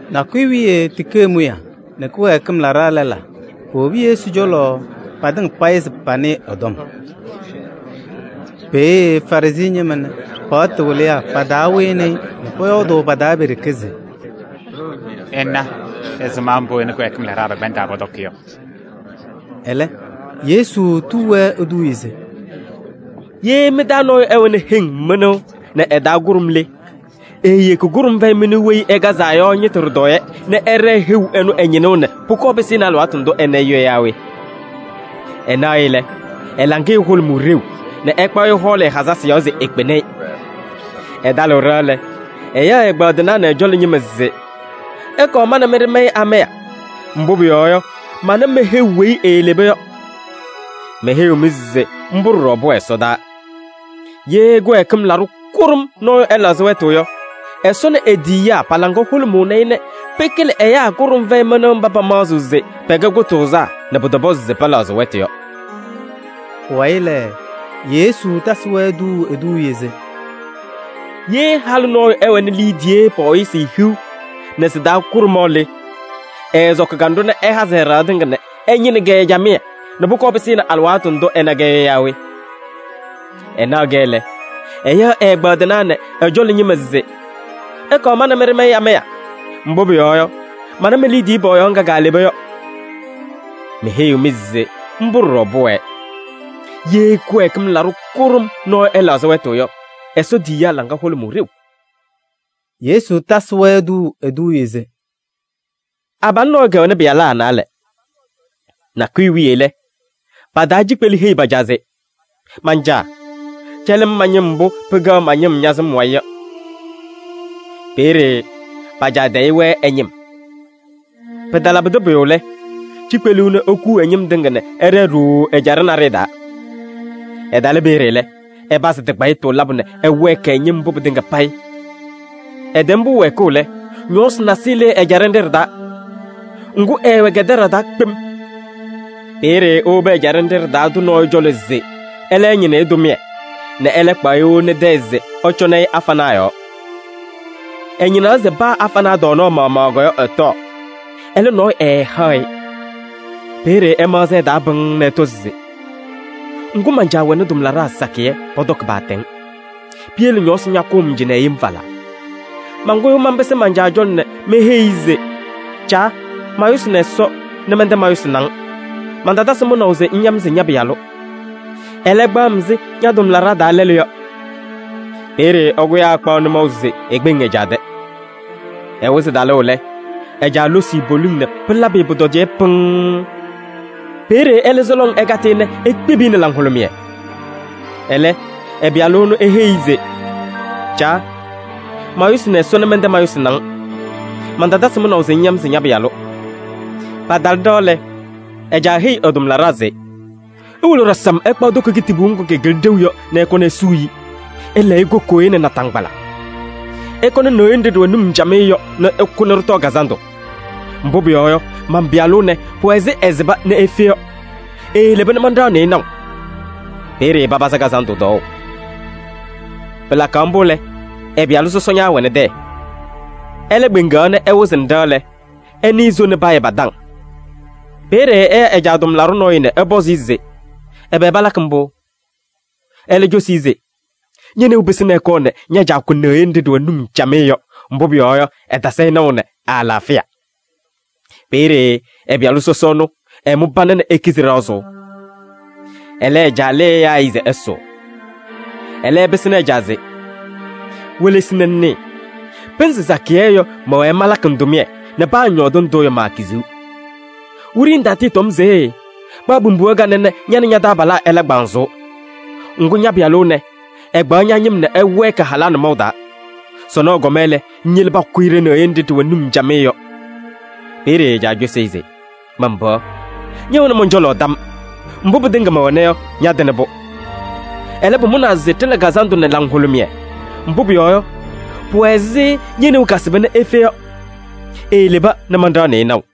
Nakʋyʋ wiye tikee mʋyaa nɛ kɩwɛɛkɩm laɖaa lɛlaa powobi Yesu cɔlɔ patɩŋa payɩ se panɩɩ ɛ-tɔm. Peeye Farɩsɩ ñɩma nɛ paɣtʋ wɩlɩyaa pa-taa wɩnɩ-ɩ nɛ pɔyɔɔdʋʋ pa-taa pe-ɖeke se: “Ɩna ɛzɩma mbʋ ɛ nɛ kɩwɛɛkɩm laɖaa pɛkpɛndaa pɔtɔkɩ yɔ!” Ɛlɛ Yesu tuu-wɛ eduuye se: “Ye mɩ-taa nɔɔyʋ ɛwɛnɩ heŋ mɩnʋʋ nɛ ɩ-taa kʋɖʋm le, eeyeki kʋɖʋm fɛyɩ mɩnʋʋ weyi ɩkazaa yɔ ñɩtʋ ɖɩtɔɔyɛ nɛ ɛɖɛɛ heu ɛnʋ ɛ-ñɩnʋʋ nɛ pʋkɔɔ pɩsɩnɩ alɩwaatʋ ndʋ ɛna-ɩ yɔ yaa we? Ɛnaɣ-ɩ lɛ, ɛ-laŋɩyɛ hʋlʋmʋʋ ɖeu nɛ ɛkpaɣ-ɩ ɛhɔɔlɩ ɛ-hazasɩ yɔɔ se ekpeni-i. Ɛtalɩɣ ɖɩɣa lɛ, ɛyaɣ ɛ-ɛgbaadɩnaa nɛ ɛ-cɔlɔ ñɩma se: ‘Ɩkɔɔ ma nɛ mɩ ɖɩmayɩ amaya. Mbʋ pʋyɔɔ yɔ, mana me-heu weyi eeleba yɔ.’ Meheyiɣ-mɩ se mbʋ ɖɔɖɔ pʋwɛ ɛsɔdaa: ye kɩwɛɛkɩm laɖʋ kʋɖʋm nɔɔyʋ ɛlɛɣzɩ wɛtʋ yɔ, Ɛsɔ nɛ e-tiyiyaa pa-laŋa hʋlʋmʋʋnɩ-ɩ nɛ pɩkɩlɩ ɛyaa kʋɖʋm fɛyɩ mɩnʋʋ mba pamaɣzɩɣ se pɛkɛ kʋtʋʋzaa nɛ pʋtɔpɔzɩ se pɛlɛɣzɩ wɛtʋ yɔ.” Pʋwayɩ lɛ, Yesu tasɩ-wɛ tuuu eduuye se: “Ye halʋ nɔɔyʋ ɛwɛnɩ liidiye pɔɔyɩsɩ hiu nɛ sɩ-taa kʋɖʋmaɣ le, ɛɛsɔkɩ kanɖʋ nɛ ɛhazɩ ɛ-ɖɩɣa tɩŋa nɛ ɛñɩnɩ-kɛ camɩyɛ nɛ pʋkɔɔ pɩsɩnɩ alɩwaatʋ ndʋ ɛna-kɛ yɔ yaa we? Ɛnaɣ-kɛ lɛ, ɛyaɣ ɛ-ɛgbaadɩnaa nɛ ɛ-cɔlɔ ñɩma se: ‘Ɩkɔɔ ma nɛ mɩ ɖɩmayɩ amaya. Mbʋ pʋyɔɔ yɔ, mana me-liidiye pɔɔyaɣ ŋga kaaleba yɔ.’ Meheyiɣ-mɩ se mbʋ ɖɔɖɔ pʋwɛɛ: ye kɩwɛɛkɩm laɖʋ kʋɖʋm nɔɔyʋ ɛlɛɣzɩ wɛtʋ yɔ, Ɛsɔ tiyiyaa laŋa hʋlʋmʋʋ ɖeu.” Yesu tasɩ-wɛ tuuu eduuye se: “Abalʋ nɔɔyʋ kɛwɛnɩ pɩyalaa naalɛ. Nakʋyʋ wiye lɛ, pa-taa cikpelu heyi pa-caa se: ‘Man-caa! Cɛlɩ-m ña-ñɩm mbʋ pɩkɛɣ ma-ñɩmbʋ ña-sɩm wayɩ yɔ.’ Peeye pa-caa tayɩ-wɛ ɛ-ñɩm. Pɩtalabɩdɩ pʋyʋ lɛ, cikpelu ɛnʋ ekuu ɛ-ñɩm tɩŋa nɛ ɛɖɛɛ ɖooo ɛjaɖɛ naɖɩyɛ taa. Ɛtalɩ peeye lɛ, ɛpazɩ tɩkpayɩtʋ labʋ nɛ ɛwɛɛkɩ ɛ-ñɩm mbʋ pɩtɩŋa payɩ. Ɛtɛm-pʋ wɛɛkʋʋ lɛ, ñɔɔsɩ nasɩyɩ lɩɩ ɛjaɖɛ nɖɩ ɖɩ-taa. Ŋgʋ, ɛɛwɛ kɛdɛɖaɣ taa kpem. Peeye ewobi ɛjaɖɛ nɖɩ ɖɩ-taa tʋ nɔɔyʋ cɔlɔ se ɛlɛ ɛñɩnɩ-ɩ tʋmɩyɛ nɛ ɛlɛ kpaɣ-ɩ ewoni tɛyɛ se ɛcɔŋnɩ-ɩ afanaa yɔɔ. Ɛñɩnaɣ se paa afanaa tɔɔnaɣ maɣmaɣ yɔ ɛtɔɔ. Ɛlɛ, nɔɔyʋ ɛɛhaɣ-ɩ. Peeye ɛmaɣzɩ ɛ-taa pɩŋŋ nɛ ɛtɔ se: ‘Ŋgʋ, man-caa wɛnɩ tʋmlaɖaa sakɩyɛ, pɔtɔkɩ paatɛŋ. Piyele ñɔɔsɩ ñakʋʋ-m cɩnɛ yem falaa! Mankʋyʋʋ manpɩsɩ man-caa cɔlɔ nɛ meheyi-i se: caa! Mayʋsɩnɩ Ɛsɔ nɛ mɛntɛ mayʋsɩnɩ-ŋ. Mantatasɩ mʋnaʋ se ŋya-m se ña-pɩyalʋ. Ɛlɛ, kpaɣ-m ɛzɩ ña-tʋmlaɖaa taa lɛlʋ yɔ.’ Peeye ɛkʋyaa ɛkpaɣ nʋmɔʋ se ekpeŋ ɛ-caa tɛ. Ɛwɩzɩ talʋʋ lɛ, ɛ-caa losi-i poliŋ nɛ pɩlabɩ-ɩ pʋtɔdɩyɛ pɩŋŋ. Peeye ɛlɛ se lɔŋ ɛkatɩ-ɩ nɛ ekpibi-i nɛ laŋhʋlʋmɩyɛ. Ɛlɛ ɛ-pɩyalʋ ɛnʋ eheyi-i se: ‘Caa! Mayʋsɩnɩ Ɛsɔ nɛ mɛntɛ mayʋsɩnɩ-ŋ. Mantatasɩ mʋnaʋ se ŋya-m se ña-pɩyalʋ.’ Patalɩ ɖɩɣa lɛ, ɛ-caa heyi ɛ-tʋmlaɖaa se: ‘Iwolo ɖasam ɩkpaɣ toko kitibuu ŋgʋ kɩkɩlɩ ɖeu yɔ nɛ ɩkɔnɩ isuu-i. Ɩlɛɛ-ɩ kokooye nɛ naataŋgbala. Ɩkɔnɩ neɣye nɖɩ ɖɩwɛ num camɩyɛ yɔ nɛ ɩkʋ nɛ ɖɩtɔɔ kazandʋ. Mbʋ pʋyɔɔ yɔ, man-pɩyalʋ ɛnɛ, pʋwɛ ɛzɩ ɛsɩba nɛ efe yɔ. Eeleba nɛ manɖaɣnɩ-ɩ naʋ.’ Peeye papazɩ kazandʋ tɔɔʋ. Pɩlakaɣ mbʋ lɛ, ɛ-pɩyalʋ sɔsɔ ñaawɛnɩ tɛyɛ. Ɛlɛ kpeŋaɣ nɛ ɛwɩzɩnɩ ɖɩɣa lɛ, ɛnɩɩ soo nɛ payɛ pa-taŋ. Peeye ɛya ɛ-caa tʋmlaɖʋ nɔɔyʋ nɛ ɛpɔzɩ-ɩ se: ‘Ɛbɛ palakɩ mbʋ?’ Ɛlɛ cosi-i se: ‘Ñe-neu pɩsɩnɩ ɛkɔɔ nɛ ña-caa kʋ neɣye nɖɩ ɖɩwɛ num camɩyɛ yɔ, mbʋ pʋyɔɔ yɔ, ɛtasɩ-ɩ naʋ nɛ ɛ-alaafɩya.’ Peeye ɛ-pɩyalʋ sɔsɔ ɛnʋ ɛmʋ pana nɛ ekizi ɖɩɣa sʋʋ. Ɛlɛ ɛ-caa lɩɩ ɛyaa-ɩ se ɛsʋʋ. Ɛlɛ ɛpɩsɩnɩ ɛ-caa se: ‘Welesi nɛ ŋnɩɩ, pɩnzɩ sakɩyɛ yɔ, mɛwɛɛ malakɩ-ŋ tʋmɩyɛ nɛ paa ŋyɔɔdɩ ndʋ yɔ, maakiziɣ.’ Wiɖiyi ŋtatɩɩtɔm se: ‘Kpaɣ pimbiɣa kanɛ nɛ ña nɛ ña-taabalaa ɩla kpanzʋʋ.’ Ŋgʋ, ña-pɩyalʋ ɛnɛ, ɛkpaɣ ña-ñɩm nɛ ɛwɛɛkɩ halaa nʋmɔʋ taa. Sɔnɔ ɛkɔma lɛ, ŋyele pakʋ-ɩ ɖe-neɣye nɖɩ ɖɩwɛ num camɩyɛ yɔ. Peeye ɛ-caa cosi-i se: ‘Man-pɩɣa! Ñɛwɛnɩ mɔn-cɔlɔ tam. Mbʋ pɩtɩŋa mɛwɛna yɔ, ñatɩnɩ-pʋ. Ɛlɛ, pʋmʋnaa se ɖɩla kazandʋ nɛ laŋhʋlʋmɩyɛ. Mbʋ pʋyɔɔ yɔ, pʋwɛ ɛzɩ ñe-neu kasɩba nɛ efe yɔ, eeleba nɛ manɖaɣnɩ-ɩ naʋ.’”